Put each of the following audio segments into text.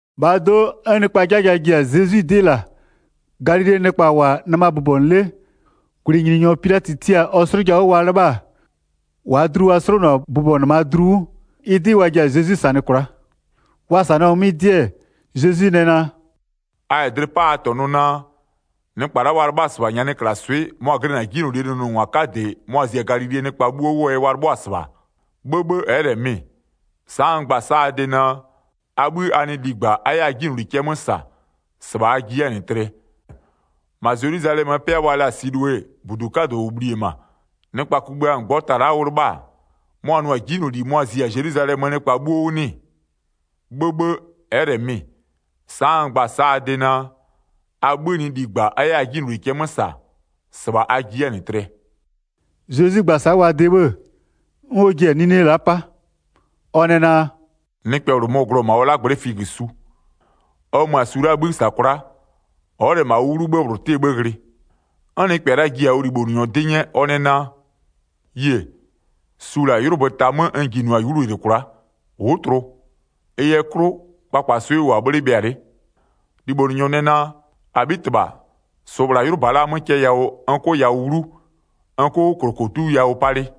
1-Bhaa do'o, 'n nɩkpaa 'jaja ji-a Zezwi 'dɩ -la, Galilee nɩkpa -wʋ-a nɩma bʋbɔnʋ 'le, -gwlɩnyininyɔ Pilatɩ tia-a ɔ 'slʋja 'wʋ wa 'lɩbha-a, -waa dlu ɔ 'slonʋ-a bʋbɔnʋnɩmaa dlu 'wʋ, ɩ 'dɩ wa ji-a Zezwi -sanɩ kwla'a. Wa -sanɩɔ-a 'mɩ 'dɩ-ɛ, Zezwi nɛ naa: “A -yɛ dlɩ 'pa a -tɔnʋ naa, nɩkpa la'a wa 'lɩbha-a -sɩbha nyanɩklaswɩ'ɩ mʋa-a glɩnɩ-a 'jinylolie nʋnʋngwa 'kadɩ mʋa-a zi-a -ma Galilee nɩkpa 'bhuo 'wʋɔ yɛ wa 'lɩbhʋa-a? 'Bhëbhë, ɛ'ɛ -lɛ mɩ-ɩ, sa'a n gba-a sa'a a de naa: A 'bhï a nɩ ligba, a 'yɛ a 'jinyloli cɛ 'mö -sa, -sɩbha a ji 'yɛ-a -nɩ tlɩɛ. 4-Ma Zelwizalɛmöö 'pɩa wa la-a Silowe, -budu 'kadʋ -ʋ bhli-e -ma, nɩkpa kugbïa -ngbɔta la'a ʋ 'lɩbha-a, mʋa-a nʋ-a 'jinyloli mʋa-a zi-a Zelwizalɛmöö nɩkpa -mʋabha 'bhuo 'wʋ 'nɩ-ɩ? 'Bhëbhë, ɛ'ɛ -lɛ mɩ-ɩ, sa'a n gba-a sa'a a de naa, a 'bhï a nɩ ligba a 'yɛ a 'jinyloli cɛ 'mö -sa, -sɩbha a ji 'yɛ-a -nɩ tlɩɛ.” Zezwi gba-a sa'a wa de 'bhë-ë, 'n ɔ ji-a 'nine la'a 'pa. Ɔ nɛ naa: “Nɩkpɛ -bhlʋ mɔ-ɔ glʋ-ɔ -ma ɔ 'lagblɛ'ɛ figösu. Ɔ mö-a su la'aa 'bhï -sa kwla'a, ɔ'ɔ -lɛ -ma ʋ 'wlu 'bhë -bhlʋ 'tɩɛ 'bhë ghlɩ. 'N nɩkpɛ la'a ji-a ɔ libhonʋnyɔ 'dɩ 'nyɛ, ɔ nɛ naa: Yie, su -la 'ylʋbö ta 'mö n jinʋ-a 'wlu -yɩlɩ kwla'a, ʋ'ʋ tlʋ. Ɩ yɛ 'klʋ, kpakpaswɩ'ɩ ʋ -wʋ-a 'bhle bhɩa 'le. Libhonʋnyɔ nɛ naa: -Abhitɩbha -sʋʋ -bhla 'ylʋba la'a 'mö cɛ yawʋ n 'kʋ yawʋ 'wlu, n 'kʋ -klokodu yawʋ palɩ.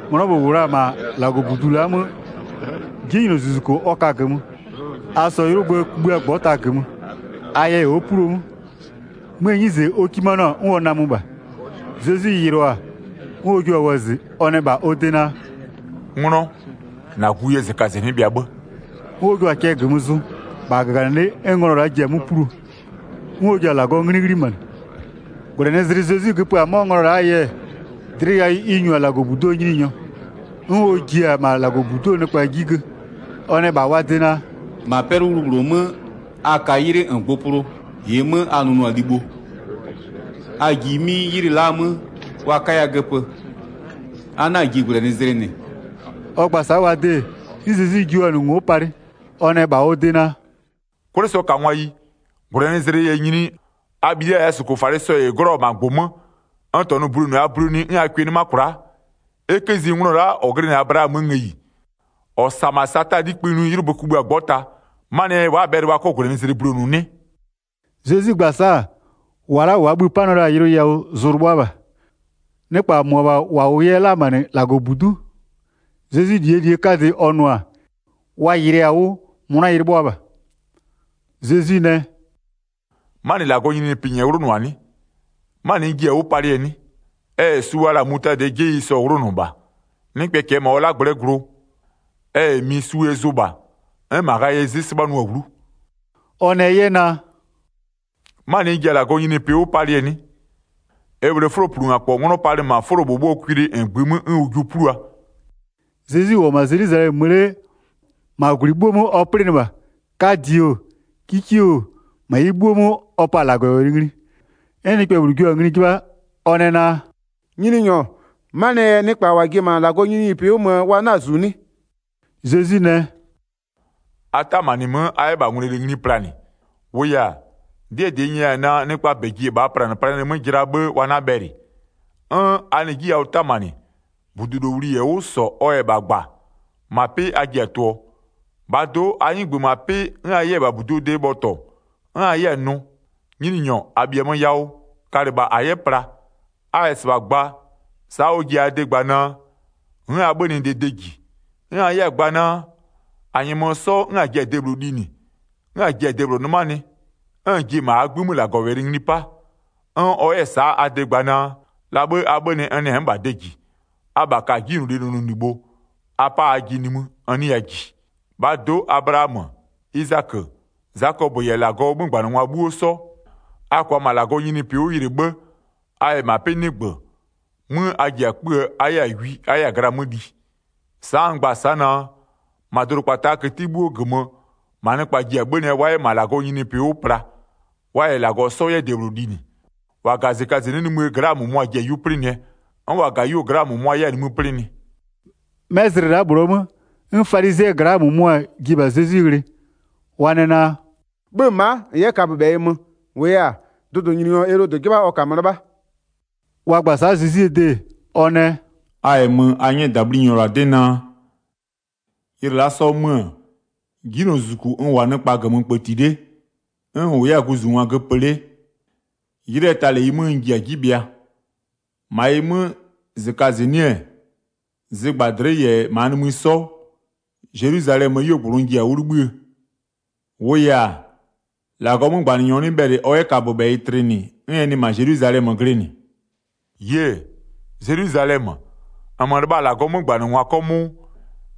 'nglɔ -bhlʋ -wʋ la-a -ma -Lagɔbudu la'aa 'mö 'jinylozuzuko ɔ ka-a -gömö, a -sɔɔ 'ylʋbö kugbïa -ngbɔta -gömö. A yɛ ɔ'ɔ 'pluo 'mö, 'möö 'nyize ɔ 'kimanɩɔ-a 'n ɔ namö -bha. Zezwi yɩlɩɔ-a, 'n ɔ jio-a wɔzɩ ɔ nɛ -bha ɔ de naa: “'Nglɔ, -na gu yɛ -zɩkazɩnɩ'ɩ bhɩa 'bhë.” 'N ɔ jio-a cɛ -gömö zʋ, -bha -gaganɩlɩ'ɩ 'n nglɔ la'a ji-a 'mö 'pluo, 'n ɔ ji-a -Lagɔɔ 'nglɩ 'ghlimanɩ. 14-Gwlɛnɩzlɩ Zezwi göpö-a 'mɔ nglɔ la'aa yɛ, dlɩ yawʋ ɩ -nyu la-a -Lagɔbuduo nyininyɔ. 'N ɔ ji-e -ma -Lagɔbudu'uo nɩkpa 'ji gö. Ɔ nɛ -bha wa de naa: “-Ma 'pɛlʋwlu -bhlʋ 'mö a ka 'ylɩ -ngbʋpʋlʋ -ɩɩ 'mö a nʋnʋa libho, a ji 'mɩ ylɩ la'a 'mö wa 'kaya göpö, a 'na-a ji -gwlɛnɩzlɩ -nɩ.” Ɔ gba-a sa'a wa de, 'n Zezwi jio-a ngo'o palɩ, ɔ nɛ -bha ɔ de naa: “'Kwlɩsɔkangwayi, -gwlɛnɩzlɩ -yɛ nyini, a bhilia -yɛ a -sʋkʋfalɩ sɔ -ɩ 'glɔ-ɔ -ma -gbʋ 'mö, n -tɔnʋ bulonʋ a bulonʋɩ 'n a kʋɩ 'nɩma kwla'a? E 'kë zi nglɔ la'a -ɔ glɩnɩ-a Ablaamöö ngëyi, -ɔ -sa-a -ma Sataa 'likpï ngli 'ylʋbö kugbïa -ngbɔta, 'manɩɛ yɛ wa'a-a bhɛlɩ wa 'kɔ -gwlɛnɩzlɩ bulonʋ 'nɩ?” Zezwi gba-a sa'a, -wa la'a -waa bhï-ï 'panɩɔ la-a yʋlʋ yawʋ zʋ-ʋ 'lɩbhʋa -bha. Nɩkpa -mʋabha -wa -wʋ 'yɛ la-a -ma -nɩ -Lagɔbudu'u, Zezwie -lie -li 'kadɩ ɔ nʋ-a, wa yɩlɩɩ-a 'wʋ, 'mʋna-a 'lɩbhʋa -bha. Zezwi nɛ: “'Manɩ -Lagɔɔ nyininyinipɩ -nyɛɛ 'wlʋnʋ-a 'nɩ? 'Manɩ n jiɛ-a 'wʋ palɩɛ 'nɩ? Ɛ -yɛ su wa la-a mutadɩɛ 'jeyi 'sɔ 'wlʋnʋ -bha. Nɩkpɛ -kɛɛ -ma ɔ 'lagblɛ'ɛ glʋ, ɛ -yɛ mi su ɛ zʋ -bha, 'n -ma ghayɩɛ 'zɩ 'sɩbhanʋ-a 'wlu.” Ɔ nɛ 'yɛ naa: “'Manɩ n ji-a -Lagɔɔ nyininyinipɩ 'wʋ palɩɛ 'nɩ? Ɛ -bhlee 'fʋloplungakpɔ 'nglɔ palɩ -ma 'fʋlobhʋbhʋɔ kwili -ngbï 'mö 'n ʋ jiʋ 'plua.” Zezwi -wʋ-ɔ -ma Zelwizalɛmö mö 'le, -ma -gwlɩ 'bhuo 'mö ɔ 'plɩnɩ -bha. 'Kadɩ oo, 'kikie oo, -ma ɩ 'bhuo 'mö ɔ 'pa-a -Lagɔwɛlɩ ngli. 'N nɩkpɛ -bhlʋ jio-a ngli 'jɩbha, ɔ nɛ naa: “Nyininyɔ, 'manɩɛ yɛ nɩkpa -wa ji-e -ma -Lagɔɔ nyininyinipɩ 'wʋ möö wa 'na-a -zu 'nɩ?” Zezwi nɛ: “A 'tamanɩ 'mö, a 'yɛ -bha ngwlele 'kikeyi ngli planɩ. -Wʋʋ yɛ-a, 'dɩɛ -dɩ n nyɛya-a naa, nɩkpaa -bɛ ji-e -bhaa planɩplanɩɛ 'mö jɩla 'bhë wa 'na bhɛlɩ. 'N a nɩ 'ji yawʋ 'tamanɩ, -budulowli -yɛ 'wʋ -sɔ, ɔ -yɛ -bha -gba, -ma 'pɩ a ji-a tʋ-ʋɔ. -Bhaa do'o, a 'nɩgbö -ma 'pɩ 'n a 'yɛ-a -bha -buduo de bhɔtɔ, 'n a 'yɛ-a nʋ: Nyininyɔ, -a -bhiamö yawʋ, kalɩ -bha -a 'yɛ pla. A -yɛ -sɩbha gba, sa'a ɔ ji-a a de gba naa: N'n a 'bhönɩdee 'bhë -ji. 'N a 'yɛ-a gba naa: -A -nyɛmö 'sɔ 'n -a ji-a debhlʋ linɩ, 'n -a ji-a debhlʋ 'nɩmanɩ, 'n -n ji-e -ma -aa 'gbï 'mö -Lagɔwɛlɩ ngli 'pa. 'N ɔ 'yɛ-ɛ sa'a a de gba naa: La 'bhë a 'bhönɩ n nɛ n'n -bha de ji, abha ka-a 'jinylolie nʋnʋlibho, a 'pa ajɩ nimï, n 'nɩya -ji. 28-Bhaa do'o Ablaamö, Izakö, Zakɔpö -yɛ -Lagɔɔ 'mögbanɩngwa 'bhuo 'sɔ, a -kʋa -ma -Lagɔɔ nyininyinipɩ 'wʋ yɩlɩ 'bhë, a -yɛ -ma -nɩ 'pɩ 'nɩgbö, 'mö a ji-a 'kpöö a 'yɛ-a wi a 'yɛ-a gla 'mö li. Sa'a n gba-a sa'a naa: -Ma dʋdʋkpataa këti 'bhuoo -gömö, -ma nɩkpa ji-a 'bhönɩɛ wa 'yɛ -ma -Lagɔɔ nyininyinipɩ 'wʋ pla, wa -yɛ -Lagɔ 'sɔ 'yɛ debhlʋ linɩ. 30-Wa -ga-a -zɩkazɩnɩ'ɩ nimïë gla'aa -mʋmʋa-a ji-a 'yu 'plɩnɩɛ, 'n -wa -ga-a 'yuo gla'aa -mʋmʋa-a 'yɛ-a nimï 'plɩnɩ.” 'Mɛ zlɩ la'a -bhlʋɔ 'mö, 'n falizɩɛ gla'aa -mʋmʋa ji-e -bha Zezwi ghlɩ, wa nɛ naa: “'Bhö-ö ma'a -n 'yɛ kaböbhɛyɩ mö, -wʋʋ yɛ-a, dʋdʋnyininyɔ Elodɩ 'jɩbha ɔ -kamö 'lɩbha.” Wa gba-a sa'a Zezwie de, ɔ nɛ: “A -yɛ 'mö a 'nyɛ -dabhlinyɔ -la 'dɩ naa: Ylɩ la'a 'sɔɔ 'mö-ö, 'jinylozuzuku n -wʋ-a nɩkpa -gömö kpëti 'le, 'n n -wʋ 'yɛ-a guzungwa göpö 'le, 'ylɩɛ ta -leyi 'mö n ji-a 'ji bhɩa. 33-Ma ɩ 'mö, -zɩkazɩnɩ'ɩ-ɛ, zɩgbadlɩ'ɩ -yɛ -maanimï 'sɔ, Zelwizalɛmöö 'yuogblʋ n ji-a bhlie, -wʋʋ yɛ-a, -Lagɔɔ 'mögbanɩnyɔ 'nɩ bhɛlɩ ɔ 'yɛ kaböbhɛyɩ tlɩnɩ 'n ɛ nɩ -ma Zelwizalɛmö glɩnɩ. Yie! Zelwizalɛmö, -nmö lɩbha-a -Lagɔɔ 'mögbanɩngwa 'kɔmʋʋ,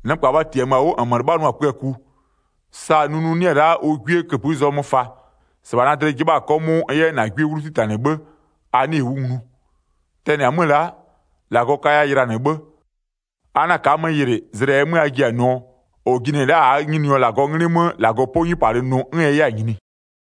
nɩkpa wa -tiamö-a 'wʋ -nmö 'lɩbhanʋa-a kpöaku, sa nunu 'nɩ-ɛ la'a ʋ 'gwie -këpï zɔmö fa, -sɩbha na dlɩ 'jɩbha-a 'kɔmʋʋ n 'yɛ na 'gwie 'wlu 'titanɩ 'bhë, a 'nɩɩ-ɩ 'wʋ nglu. Tɛnɩ-a 'mö la'a, -Lagɔ kaya ylanɩ 'bhë, a 'na ka'a-a 'mö yɩlɩ, zlɩ -ɛɛ mö a ji-a nʋɔ: -Ɔ jinɩ-ɛ la'a -aa Nyininyɔ -Lagɔɔ 'nglɩ 'mö, -Lagɔ 'pɔ 'nyupalɩ nʋ 'n ɛ 'yɛ-a nyini.”